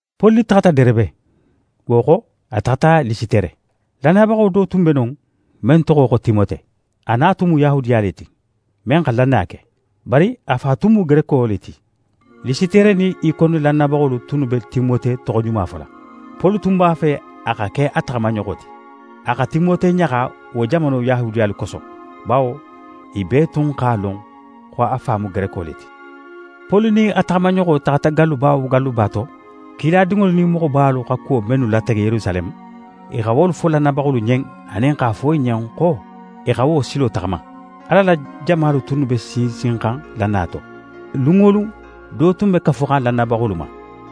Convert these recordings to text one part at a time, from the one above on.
Poli taxata Derebe, wo xo, a taxata Lisitere. Lannayabaxo do tun be non, men toxo xo Timote. A na tun mu Yahudiya le ti, men xa lannaya ke. Bari a fa tun mu Gereko le ti. Lisitere nin Ikone lannayabaxolu tunnu be Timote toxoɲuma fola. Poli tun b'a fe a xa ke a taxamaɲoxo ti. A xa Timote ɲaxa wo jamano Yahudiyalu koso, bawo i bee tun x'a lon xo a fa mu Gereko le ti. Poli nin a taxamaɲoxo taxata galluba wo galluba to, kiladinŋolu nin moxobalu xa kuwo mennu latege Yerusaleme, i xa wolu fo lannayabaxolu ɲen anin x'a fo i ɲen xo i xa wo silo taxama. Ala la jamalu tunnu be sinsinxan lannaya to. Lun wo lun, do tun be kafuxan lannayabaxolu ma.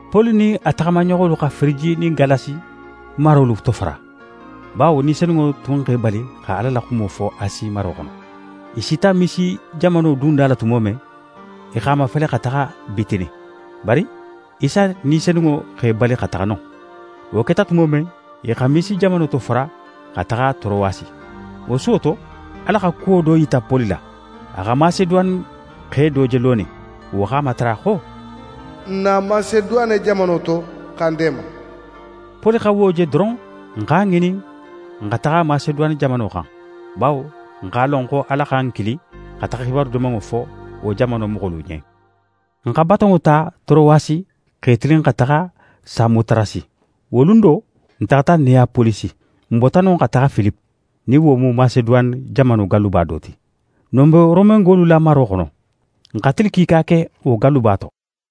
Poli nin a taxamaɲoxolu xa Firiji nin Galasi marolu tofara, bawo Ni Senunŋo tun x'e bali xa Ala la xumo fo Asi maro xono. I sita Misi jamano dunda la tumo men, i x'a mafele xa taxa Bitini, bari Isa Ni Senunŋo x'e bali xa taxa non. Wo keta tumo men, i xa Misi jamano tofara xa taxa Torowasi. Wo suwo to, Ala xa kuwo do yita Poli la. A xa Maseduwane xe do je lonin, wo x'a matara xo: «Na Maseduwane jamano to, xa n deema!» Poli xa wo je doron, n x'a ŋinin xa taxa Maseduwane jamano xan, bawo n x'a lon xo Ala xa n kili xa taxa xibaru Dimanŋo fo wo jamano moxolu ɲen. N xa batonŋo ta Torowasi, x'e tilin xa taxa Samotarasi. Wo lun do, n taxata Neyapolisi. N bota non xa taxa Filipe, nin wo mu Maseduwane jamano galluba do ti. Non be Romengolu la maro xono. N xa tili kiika ke wo galluba to.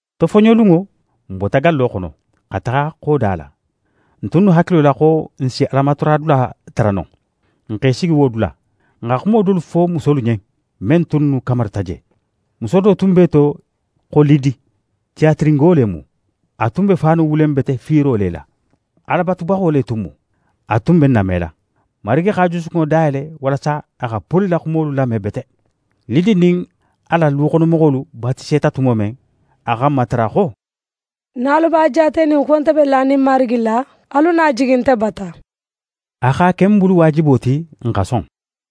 Tofoɲolunŋo, n bota gallo xono, xa taxa xoda la, n tunnu hakilo la xo n si Alamataradula tara non. N x'e sigi wo dula. N xa xumo dolu fo musolu ɲen, men tunnu kamarita je. Muso do tun be i to xo Lidi, Tiyatirengo le mu. A tun be faanu wulen bete fiiro le la. Ala batubaxo le tun mu. A tun be n namela. Marigi x'a jusukunŋo dayele walasa a xa Poli la xumolu lame bete. Lidi nin a la luxonomoxolu batiseta tumo men, a xa n matara xo: «Nin alu b'a jaatenin xo nte be lanin Marigi la, alu na jigi nte bata.» A x'a ke n bulu waajibo ti n xa son.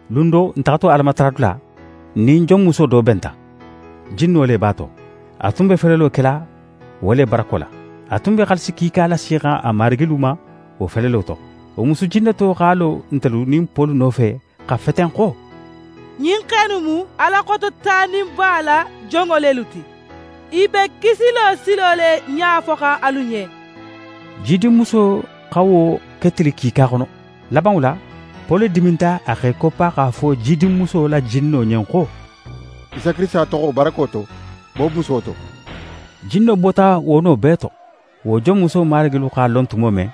Lun do, n taxato Alamataradula, n nin jonmuso do benta: Jinno le b'a to, a tun be felelo kela wo le barako la. A tun be xaalisi kiika lasixan a marigilu ma wo felelo to. Wo musu jinneto x'a lo ntelu nin Poli nofe xa feten xo: «Ɲin xe innu mu Ala Xototaninba la jonŋo lelu ti. I be kisilo silo le ɲafoxan alu ɲen.» Jidinmuso xa wo ke tili kiika xono. Labanŋo la, Poli diminta, a x'é koppa x'a fo jidinmuso la jinno ɲen xo: «Isa Kirisita toxo barako to, bo muso to.» Jinno bota wo no bee to. Wo jonmuso marigilu x'a lon tumo men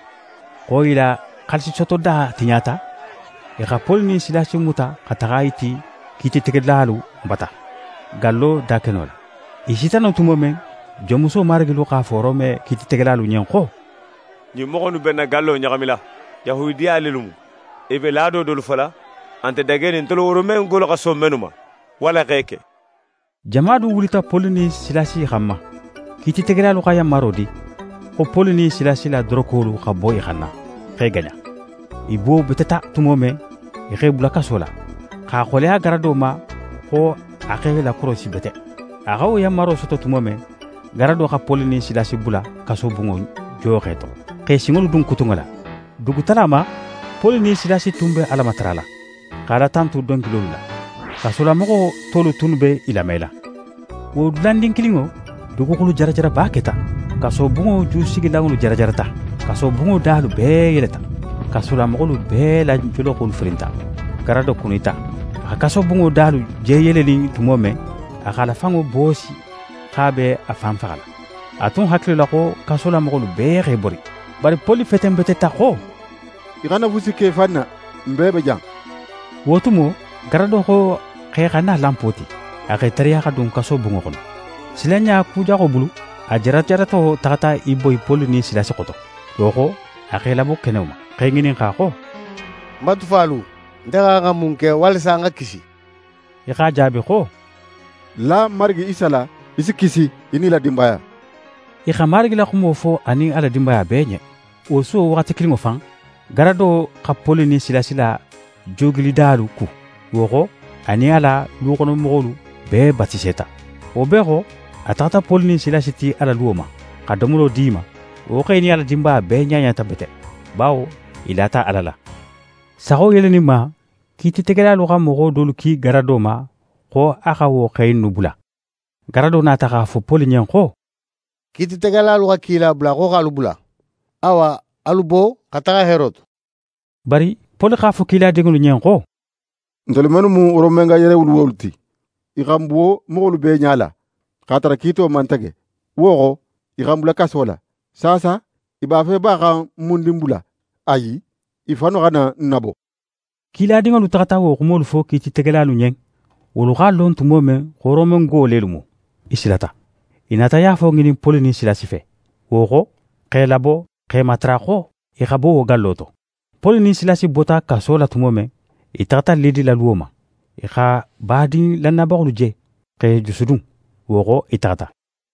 xo i la xaalisisotoda tiɲata, i xa Poli nin Silasi muta xa taxa i ti kiititegelalu bata, gallo dakeno la. I sita non tumo men, jonmuso marigilu x'a fo Rome kiititegelalu ɲen xo: «Ɲin moxo innu be n na gallo ɲaxamila; Yahudiya lelu mu. I be laado dolu fola a nte dagenin ntelu Romengolu xa son mennu ma, walla x'e ke.» Jama du wulita Poli nin Silasi xanma. Kiititegelalu xa yanmaro di, xo Poli nin Silasi la dorokolu xa bo i xanna, x'e gaɲa. I buwobeteta tumo men, i x'e bula kaso la, x'a xoleya garado ma xo a x'e lakorosi bete. A xa wo yanmaro soto tumo men, garado xa Poli nin Silasi bula kasobunŋo jooxe to, x'e sinŋolu dun kutunŋo la. Dugutala ma, Poli nin Silasi tun be Ala matarala, xa Ala tantu donkilolu la. Kasolamoxo tolu tunnu be i lamela. Wo dulandin kilinŋo, duguxulu jarajaraba keta. Kasobunŋo jusigilanŋolu jarajarata. Kasobunŋo dalu bee yeleta. Kasolamoxolu bee la joloxolu firinta. Garado kunita. A xa kasobunŋo dalu je yelenin tumo men, a x'a la fanŋo boosi xo a be a fan faxala. A tun hakilo la xo kasolamoxolu bee x'e bori. Bari Poli fetenbeteta xo: «Í xana fusi ke í fan na, n bee be jan.» Wo tumo, garado xo x'e xa na lanpo ti. A x'é tariya xa dun kasobunŋo xono. Silanɲa kujaxo bulu, a jarajarato taxata í boyi Poli nin Silasi xoto. Wo xo, a x'e labo keno ma, x'e ŋininxa xo: «Ń batufalu, nte xa xan xa mun ke walasa ń xa kisi?» I x'a jaabi xo: «La Marigi Isa la, í si kisi, í nin í la dinbaya.» I xa Marigi la xumo fo a nin a la dinbaya bee ɲen. Wo suwo waxati kilinŋo fan, garado xa Poli nin Silasi la joogilidalu ku. Wo xo, a nin a la luxonomoxolu bee batiseta. Wo bee xo, a taxata Poli nin Silasi ti a la luwo ma, xa domolo di i ma. Wo xe nin a la dinbaya bee ɲaɲata bete; bawo i lata Ala la. Saxo yeleninma, kiititegelalu xa moxo dolu ki garado ma xo a xa wo xe innu bula. Garado nata x'a fo Poli ɲen xo: «Kiititegelalu xa kila bula xo x'alu bula. Awa, alu bo xa taxa heero to.» Bari Poli x'a fo kiladinŋolu ɲen xo: «Ntelu mennu mu Romenga yerewuluwolu ti, i xa n buwo moxolu bee ɲala x'a tara kiito man tege, wo xo, i xa n bula kaso la. Saasa, i b'a fe ba xa n mundin bula? Ayi. I fannu xa na n nabo.» Kiladinŋolu taxata wo xumolu fo kiititegelalu ɲen. Wolu x'a lon tumo men xo Romengo lelu mu, i silata. I nata yaafo ŋinin Poli nin Silasi fe, wo xo, x'e labo, x'e matara xo i xa bo wo gallo to. Poli nin Silasi bota kaso la tumo men, i taxata Lidi la luwo ma. I xa badin lannayabaxolu je, x'e jusudun. Wo xo, i taxata.